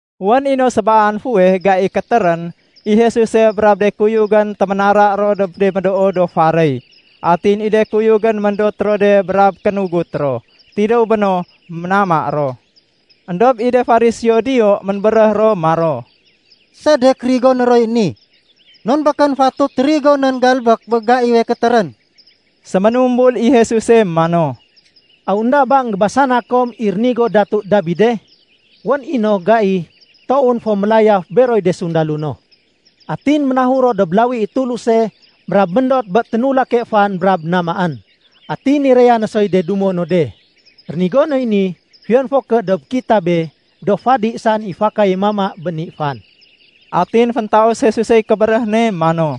Wén i no sébaan fuweh gai kétérén, i Jesuse brab de kuyugén téménara ro dob de médoo do faréy. Atin i de kuyugén méndot ro de brab kénugut ro. Tidéw béno, ménama ro. Endob i de Fariseo diyo ménbéréh ro maro, “Sedek rigoné roy ni, non békén fatut rigonén galbék bé gaiwe kétérén?” Séménumbul i Jesuse mano, “Aw énda ba énggébasana kom i rénigo Datu Dabide? Wén i no gai toowén fo mélayaf beroy de sundalo no. Atin ménahur ro dob lawi i Tuluse brab méndot bé ténulake fan brab namaén, atin niraya no soy de dumo no de. Rénigo noy ni fiyon fo ké dob kitabe, do fadi saén i fakaye mama bé ni fan.” Atin féntaus Jesusey kébéréh ne mano,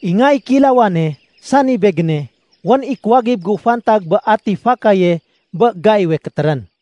“I Nga i Kéilawane, sani Begéne, wén i kuwagib gu fantag bé ati fakaye bé gaiwe kétérén.”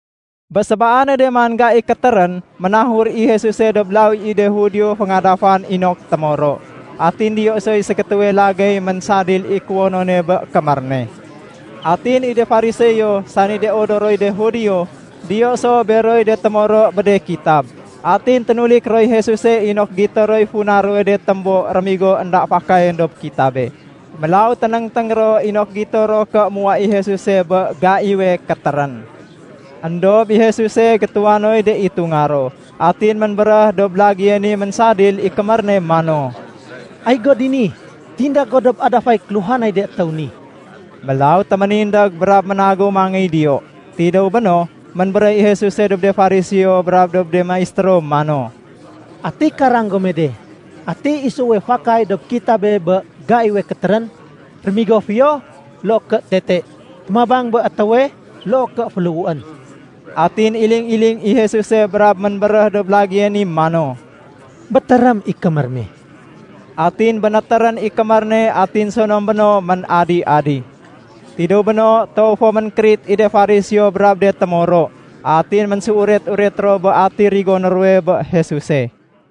Bé sébaane man gai kétérén, ménahur i Jesuse dob lawi i de Judio féngadafan inok témoro. Atin diyo soy ségétéwe lagéy ménsadil i kuwonone bé kémér ne. Atin i de Fariseo, sani de odoroy de Judio, diyo so beroy de témoro bé de kitab. Atin ténulik roy Jesuse inok gito roy funa ruwe de témbo rémigo énda fakayén dob kitabe. Mélaw ténéngténg ro inok gito ro ké muwa i Jesuse bé gaiwe kétérén. Endob i Jesuse, gétuwa noy de itunga ro. Atin ménbéréh dob lagéye ni ménsadil i kémér ne mano, “Ay go dini, tindég go dob adafay kéluhanay de étéw ni.” Mélaw téménindég brab ménagéw mangéy diyo. Tidéw béno, ménbéréh i Jesuse dob de Fariseo brab dob de maistéro mano, “Ati karang gome de, ati isuwe fakay dob kitabé bé gaiwe kétérén? Rémigo fiyo loo ké tete? Témabang bé étéwe loo ké féléhuén?” Atin iling-iling i Jesuse brab ménbéréh dob lagéye ni mano, “Bétérém i kémér me.” Atin bénétérén i kémér ne atin sonom béno ménadi-adi. Tidéw béno, toow fo ménkérit i de Fariseo brab de témoro. Atin ménséuret-uret ro bé ati rigoné ruwe bé Jesuse.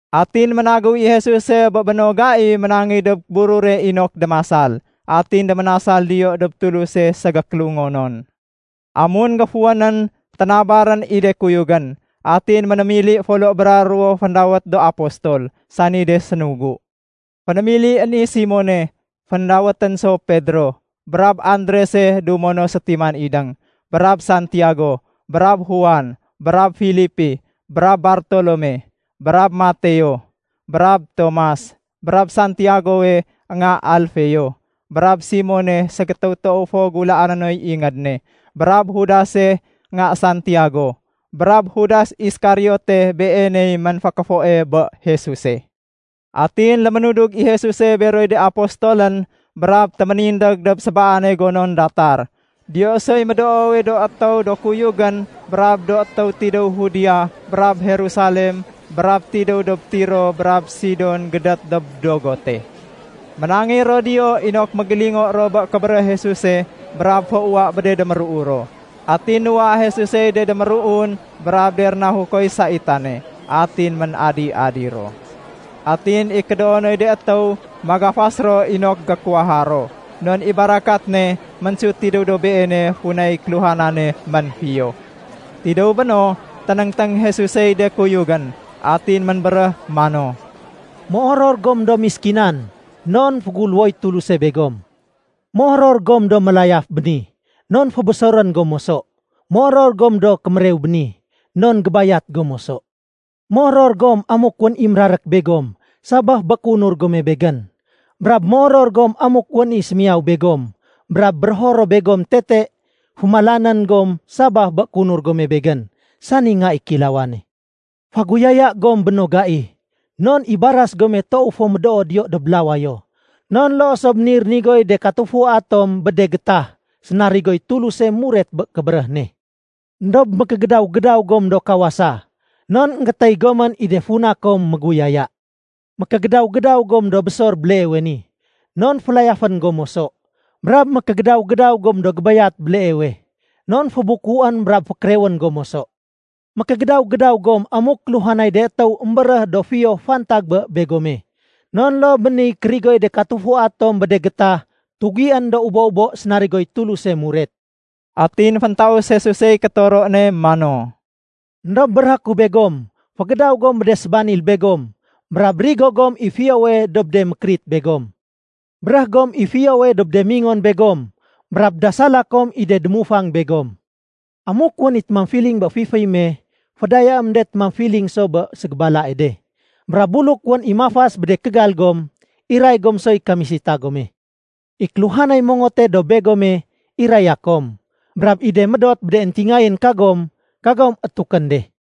Atin ménagéw i Jesuse bé béno gai ménangéy dob burure inok démasal, atin déménasal diyo dob Tuluse ségékélungonon. Amun géfuwénén, ténabarén i de kuyugén, atin ménémili folo bra ruwo féndawét do Apostol, sani de sénugu. Fénémilién i Simone (féndawétén so Pedro), brab Andrese dumo no sétiman idéng, brab Santiago, brab Juan, brab Filipi, brab Bartolome, brab Mateo, brab Tomas, brab Santiagowe nga Alfeo, brab Simone ségétéw toow fo gulaané noy ingéd ne, brab Judase nga Santiago, brab Judas Iskariote beeney ménfékéfoe bé Jesuse. Atin léménudug i Jesuse beroy de Apostolén, brab téménindég dob sébaane gonon datar. Diyo soy médoowe do étéw do kuyugén brab do étéw tidéw Judea brab Jerusalem brab tidéw dob Tiro brab Sidon gédét dob dogote. Ménangéy ro diyo inok mégélingo bé kébéréh Jesuse brab féuwa bé de déruu ro. Atin nuwa Jesusey de déméruun brab de rénahukoy saitane, atin ménadi-adi ro. Atin i kédoonoy de étéw magafas ro inok gékuwaha ro, non i barakat ne ménsut tidéw dob Beene funay kéluhanane ménfiyo. Tidéw béno, ténéngténg Jesusey de kuyugén, atin ménbéréh mano, “Méoror gom do méskinan, non féguléwoy Tuluse begom. Méoror gom do mélayaf béni, non fébésorén gom moso. Méoror gom do kémérew béni, non gébayat gom moso. “Méoror gom amuk wén i mérarék begom sabaf bé kéunur gome Begén. Brab méoror gom amuk wén i sémiyaw begom brab bérého ro begom tete fémalanén gom sabaf bé kéunur gome Begén, sani Nga i Kéilawane. Féguyaya gom bé béno gai non i baras gome toow fo médoo diyo dob lawayo. Non loo so bé niy rénigoy de katufua tom bé de gétah sénarigoy Tuluse muret bé kébéréh ne. “Endob mékégédaw-gédaw gom do kawasa, non énggétéy gomén i de funa kom méguyaya. Mékégédaw-gédaw gom do bésor béleewe ni, non félayafén gom moso. Brab mékégédaw-gédaw gom do gébayat béleewe, non fébukuén brab fékérewén gom moso. “Mékégédaw-gédaw gom amuk kéluhanay de étéw émbéréh do fiyo fantag bé begome, non loo bé niy kérigoy de katufua tom bé de gétah tugién do ubo-ubo sénarigoy Tuluse muret.” Atin féntaus Jesusey kétoro ne mano, “Endob béréhé ku begom, fégédaw gom bé de sébanil begom brab rigo gom i fiyowe dob de mékérit begom. Béréh gom i fiyowe dob de mingon begom brab dasala kom i de démufang begom. Amuk wén i témamfiling bé fiféy me, fédayaém de témamfiling so bé ségébalae de. Brab buluk wén i mafas bé de kégal gom, iray gom soy kamisita gome. I kéluhanay mongote dob begome, iraya kom. Brab i de médot bé de éntingayén kagom, kagom étukén de.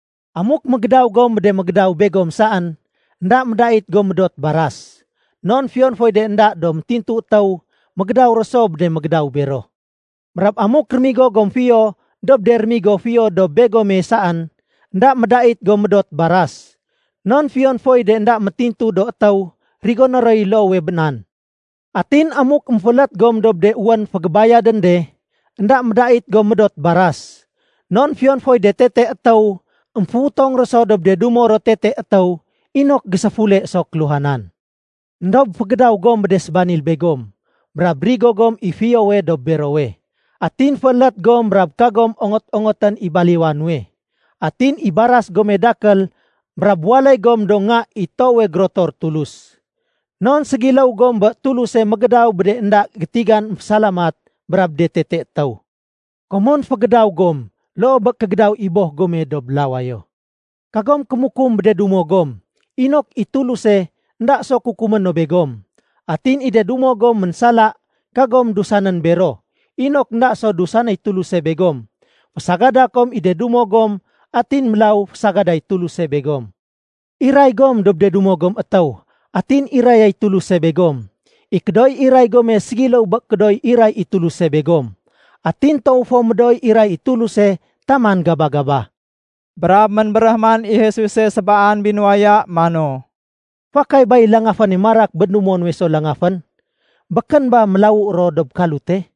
“Amuk mégédaw gom bé de mégédaw begom saén, énda médait gom médot baras. Non fiyon foy de énda do métintu étéw mégédaw ro so bé de mégédaw bero. Brab amuk rémigo gom fiyo dob de rémigo fiyo dob begome saén énda médait gom médot baras. Non fiyon foy de énda métintu do étéw rigoné roy loowe bé nan. Atin amuk émféélét gom dob de wén fégébayadén de, énda médait gom médot baras. Non fiyon foy de tete étéw émféutong ro so dob de dumo ro tete étéw inok géséfule so kéluhanan. Endob fégédaw gom bé de sébanil begom, brab rigo gom i fiyowe dob berowe. Atin féélét gom brab kagom ongot-ongotén i baliwa nuwe. Atin i baras gome dakél brab waléy gom do nga i Toowe Gérotor Tulus, non ségiléw gom bé Tuluse mégédaw bé de énda gétigan émfésalamat brab de tete étéw. Komon fégédaw gom loo bé kégédaw i Boh gome dob lawayo. “Kagom kémukum bé de dumo gom, inok i Tuluse énda so kukumé no begom. Atin i de dumo gom ménsala, kagom dusanén bero, inok énda so dusanéy Tuluse begom. Fésagada kom i de dumo gom atin mélaw fésagaday Tuluse begom. Iray gom dob de dumo gom étéw, atin irayay Tuluse begom. I kédooy iray gome ségiléw bé kédooy iray i Tuluse begom. Atin toow fo médooy iray i Tuluse taman gaba-gaba.” Brab ménbéréh man i Jesuse sébaan binuwaya mano, “Fakay bay langaféne marak bé dumo nuwe so langafén? Békén ba mélawu ro dob kalute?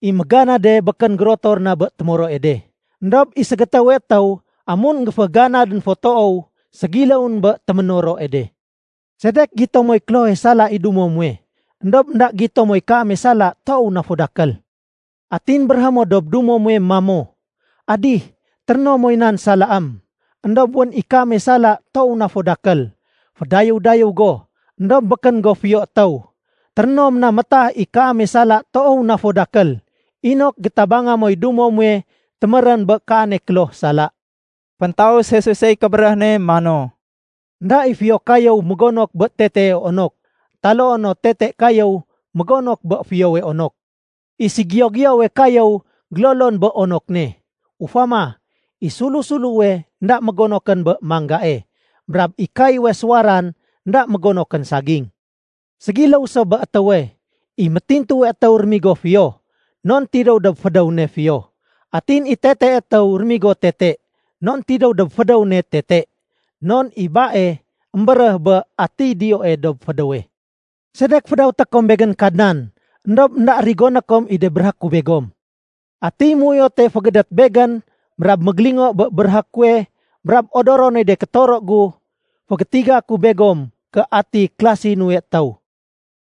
I méganade békén gérotor na bé témoroe de. Endob i ségétéwe étéw amun énggéféganadén fo toow, ségiléwén bé téménoroe de. “Sedek gito moy klohe sala i dumo muwe, éndob énda gito moy kaame sala toow na fo dakél? Atin béréhé mo dob dumo muwe mamo, ‘Adih, téréno moy nan salaém.’ Endob wén i kaame sala toow na fo dakél. Fédayéw-dayéw go, éndob békén go fiyo étéw. Téréno mo na métah i kaame sala toow na fo dakél, inok gétabanga moy dumo muwe témérén bé kaane kloh sala.” Féntaus Jesusey kébéréh ne mano, “Enda i fiyo kayéw mégonok bé tetee onok, taloo no tete kayéw mégonok bé fiyowe onok. I ségiyo-giyowe kayéw gélolon bé onok ne. Ufama, i sulu-suluwe énda mégonokén bé mangae. Brab i kayéwe suwaran énda mégonokén saging. Ségiléw so bé étéwe. I métintuwe étéw rémigo fiyo, non tidéw dob fédéw ne fiyo. Atin i tetee étéw rémigo tete, non tidéw dob fédéw ne tete. Non i bae émbéréh bé atiy diyoe dob fédéwe. “Sedek fédawété kom Begén ‘Kadnan’, éndob énda rigoné kom i de béréhé ku begom? Atiy méuyote fégédét Begén brab mégélingo bé béréhé kuwe brab odoro noy de kétoro gu, fégétiga ku begom ké ati kélasi nuwe étéw.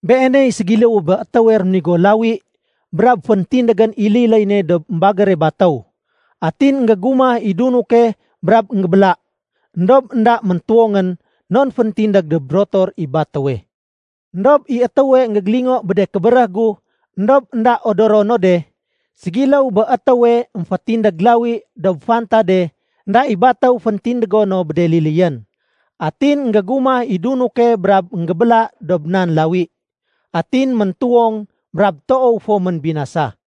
Beeney ségiléwe bé étéwe réménigo lawi brab féntindégén i liléy ne dob émbagére batéw. Atin énggégumah i dunuke brab énggébéla. Endob énda méntuwongén non féntindég dob rotor i batéwe. Endob i étéwe énggégélingo bé de kébéréh gu éndob énda odoro no de, ségiléw bé étéwe émfétindég lawi dob fantade énda i batéw féntindégo no bé de liléyén. Atin énggégumah i dunuke brab énggébéla dob nan lawi. Atin méntuwong brab toow fo ménbinasa.”